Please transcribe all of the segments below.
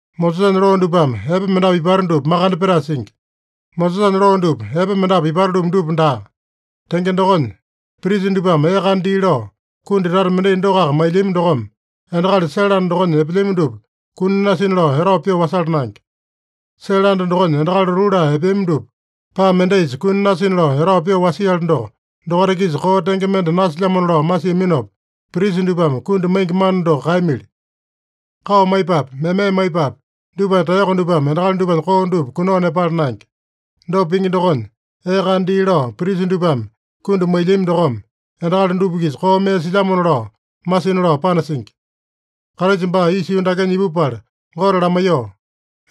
Mosesanya loo dupame epe mendapu ipata dupa makande petae singi. Mosesanya loo dupa epe mendapu ipata-lumu dupa daa. Tenge dokonya, prisa dupame ee kana dii lao kundi tata mendai dokoaka mailyami dokome, endakali sele anda dokonya epelyami dupa kuni nasina lao etao pyoo wasala naenge. Sele anda dokonya endakali lotuu laa epeami dupa paa mendaisa kuni nasina lao etao pyoo wasiali doko, dokaita-kisa koo tenge mende nasilyamona lao masiaminopa, prisa dupame kundi maingi mana doko kaeyamili. Kao maipapi, meme maipapi, dupanya taeyoko dupame endakali dupanya koo dupa kunao nepala naenge. Dopa pingi dokonya, ee kana dii lao prisa dupame kundi mailyami dokome, endakali dupa-kisa koo mee silyamona lao masina lao panasingi. Kraisa baa isa yuu dakenya ipupala Gote lamaiyoo,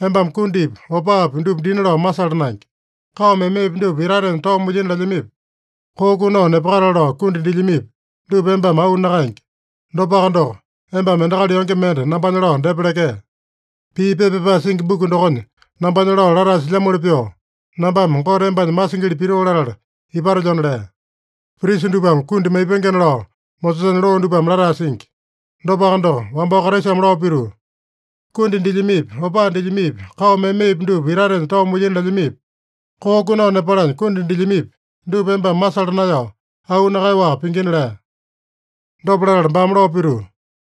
“Embame kundipi, opaapi dupa dina lao masala naenge. Kao memepi dupa itatenya tao mulyina lelyamipi, koo kunao nepakatale lao kundi dilyamipi, dupa embame auu nakaenge. Dopaka doko, embame endakali yonge mende nambanya lao depa lekee. Pii pepa pyapae singi buku dokonya nambanya lao latae silyamoli pyoo, nambame Gote embanya masingili pitoo latala ipatelyona” lea. Prisa dupame kundi maipengena lao Mosesanya loo dupame latae singi. Dopaka doko, wambao Kraisame lao pituu, “Kundi dilyamipi, opaa dilyamipi, kao memepi dupa itatenya tao mulyina lelyamipi, koo kunao nepalanya kundi dilyamipi, dupa embame masala naeyao, auu nakaeyaowaka pingina” lea. Dopa latala baame lao pituu,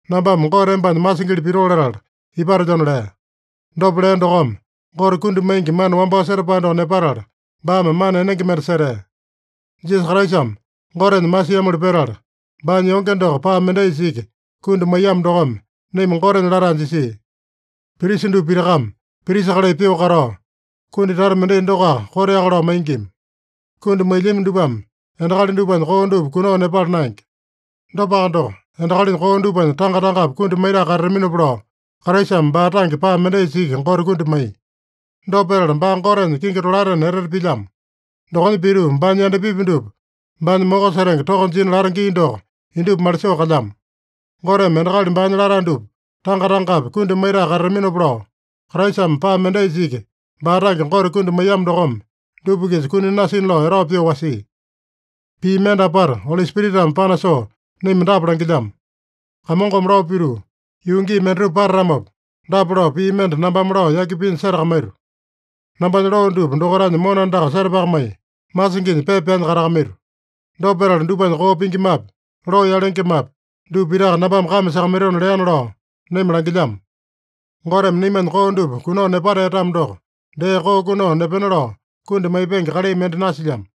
“Nambame Gote embanya masingili pitoo latala ipatelyona” lea. Dopa lea dokome, Gote kundi maingi mana wambao setapae doko nepatala, baame mana enenge mende setea. Jisasa Kraisame Gotenya masiamoli petala, baanya yonge doko paa mendaisa iki kundi maiyamo dokome, naima Gotenya latae jisia. Prisa dupa pitakame prisa kalai pyoo katao, kundi tata mendai dokoaka koteaka lao maingima. Kundi mailyami dupame endakali dupanya koo dupa kunao nepala naenge. Dopaka doko, endakalinya koo dupanya tanga-tangapi kundi maitae katataminopa lao, Kraisame baa tange paa mendaisa iki Gote kundi maiya. Dopa petala baa Gotenya kingi tolaetena etete pilyamo. Dokonya pituu baanya yandapipi dupa baanya moko setenge toko jina lata gii doko indupa malisoo kalyamo. Goteme endakali baanya latae dupa, tanga-tangapi kundi maitae katataminopa lao, Kraisame paa mendaisa iki baa tange Gote kundi maiyamo dokome, dupa-kisa kuni nasina lao etao pyoo wasia. Pii mende apata Oli Spiritame panasoo naima dapa langilyamo: “Kamongome lao pituu, ‘Yuu gii mendatupa patatamopa, dapa lao pii mende nambame lao yaki pinya setakamaito: Nambanya loo dupa dokaitanya mona andaka setapakamai, masinginya pepa pyaanya katakamaito. Dopa petala dupanya koo pingimapi, loo yalengemapi, dupa pitaka nambame kame sakamaitona’ leana” lao naima langilyamo. Goteme naimanya koo dupa kunao nepatea-tamo doko, dee koo kunao nepena lao kundi maipenge kalai mende nasilyamo.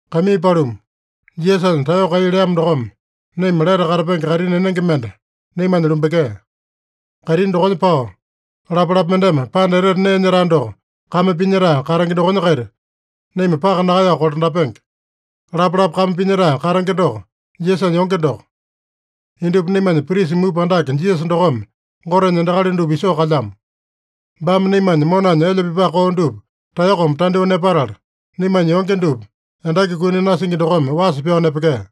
Kaimii paluma, Jisasanya taeyoko kai leamo dokome, naima lete katapenge kaitini enenge mende naimanya lumbekea. Kaitini dokonya pao, lapalapa mendeme Panda Etete Nee Nyetae doko kame pinyetae katenge dokonya-kaita naima paka nakaeyao kolandapenge. Lapalapa kame pinyetae katenge doko, Jisasanya yonge doko. Indupa naimanya prisa mupa andake Jisasa dokome Gotenya endakali dupa isoo kalyamo. Baame naimanya monanya elya pipae koo dupa taeyokome tandyoo nepatala, naimanya yonge dupa endaki kuni nasingi dokome wasa pyao nepekea.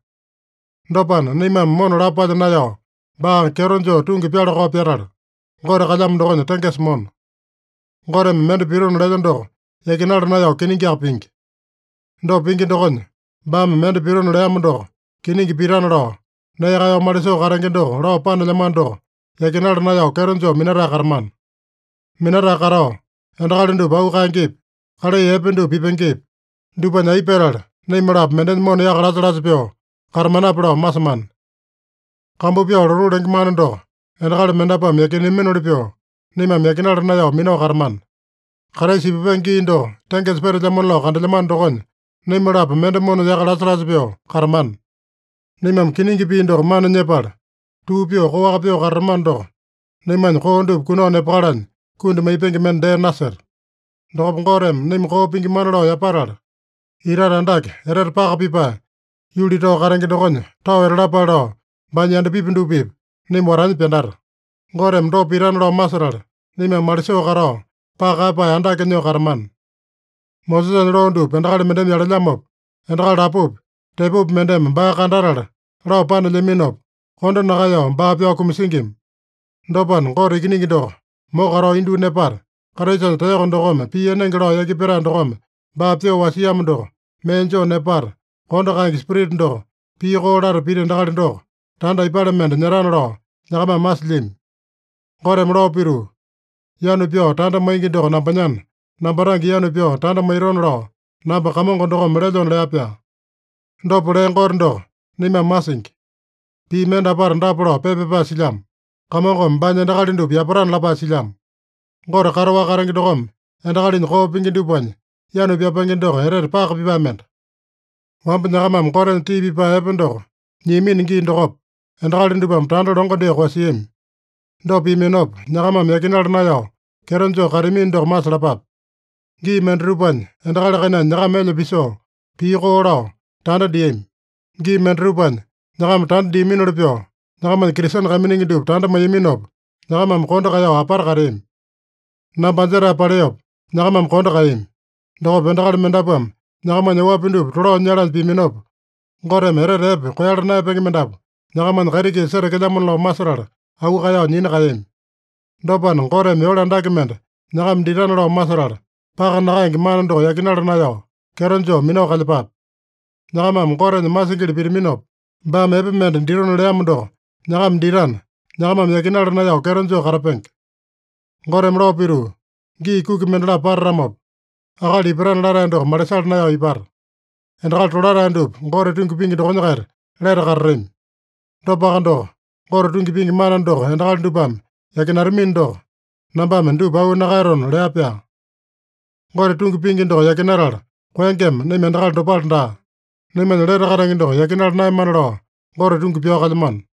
Dopana, naimame mona lapo palya naeyao, baa kyeto joo tungi pyala-kao pyatala, Gote kalyamo dokonya tengesa mona. Goteme mende pitona lelya doko yakinala naeyao kiningiaka pingi. Dopa pingi dokonya, baame mende pitona leamo doko kiningi pitana lao, nee kaeyao malisoo katenge doko lao panelyamano doko yakinala naeyao kyeto joo minatae katamana. Minatae katao, endakali dupa auu kaengepi, kalai epe dupa pipengepi, dupanya aipa petala naima-lapo mendenya mona yaka lasa-lasa pyoo katamanape lao masemana. Kambu pyao lotuu lenge mana doko endakali mendapuame yakineaminoli pyoo, naimame yakinala naeyao minao katamana. Kraisa ipupenge gii doko tengesa petelyamona lao kandelyamano dokonya, naima-lapo mende mona yaka lasa-lasa pyoo katamana. Naimame kiningi pii doko mana nyepala, tuu pyoo koaka pyoo katatamano doko, naimanya koo dupa kunao nepakalanya kundi maipenge mende dee naseta. Dokopa Goteme naima koo pingimana lao yapatala, itate andake, etete paka pipae, yuli tao katenge dokonya tao etalapale lao, baanya yandapipi dupa-pipa naima watanya pyandata. Goteme dopa pitana lao masetala, naimame malisoo katao, paka kaeyapae andake nyoo katamana. Mosesanya loo dupa endakali mendeme yalelyamopa, endakali lapopi tepopi mendeme baa kandatala lao panelyaminopa, kondo nakaeyao baa pyao kumasingima. Dopana, Gote Ikiningi doko moko katao indyoo nepata, Kraisanya taeyoko dokome pii enenge lao yaki petae dokome baa pyoo wasiamo doko mee joo nepata, kondo kaenge Spirita doko pii koo lata pita endakali doko, tanda aipale mende nyetana lao nyakamame masilyami? Goteme lao pituu, “Yanu pyao tanda maingi doko nambanyana, namba tange yanu pyao tanda maitona lao namba Kamongo dokome lelyona” lea-pyaa. Dopa lea Gote doko naimame masingi. Pii mende apata dapa lao pepa pyapae silyamo: “Kamongome baanya endakali dupa yapatana” lapae silyamo. Gote kataowaka katenge dokome endakalinya koo pingi dupanya yanu pyapenge doko etete paka pipae mende. Wamba nyakamame Gotenya tii pipae epe doko nyiamino gii dokopa, endakali dupame tanda longo dyoo koeyasiami. Dopa piaminopa, nyakamame yakinala naeyao kyeto joo kateamino doko masalapape. Gii mendatupanya, endakali kainanya nyakama elya pisoo, pii koo lao, tanda diami. Gii mendatupanya, nyakama tanda diaminoli pyoo nyakamanya Kristene kaiminingi dupa tanda maiyaminopa, nyakamame kondo kaeyao apata kateami. Namba anjetae paleopa nyakamame kondo kaeyami. Dokopa endakali mendapuame nyakamanya oapi dupa tolao nyalanya piaminopa, Goteme etete epe koeyala naeyapenge mendapu nyakamanya kaiti-kisa setekelyamona lao masetala, auu kaeyao nyina kaeyami. Dopana, Goteme yole andake mende nyakama ditana lao masetala, paka nakaenge mana doko yakinala naeyao kyeto joo minao kalyepape. Nyakamame Gotenya masingili pitaminopa, baame epe mende ditona leamo doko nyakama ditana, nyakamame yakinala naeyao kyeto joo katapenge. Goteme lao pituu, “Gii kuki mendalapo patatamopa, akali ipatana latae doko malisala naeyao ipata. Endakali tolatae dupa Gote tungi pingi dokonya-kaita lete katatami. Dopaka doko, Gote tungi pingi mana doko endakali dupame yakinatamino doko, nambame dupa auu nakaeyatona” lea-pyaa. Gote tungi pingi doko yakinatala koengema, naima endakali dopale daa. Naimanya lete katenge doko yakinala naeyamana lao, Gote tungi pyao kalyamano.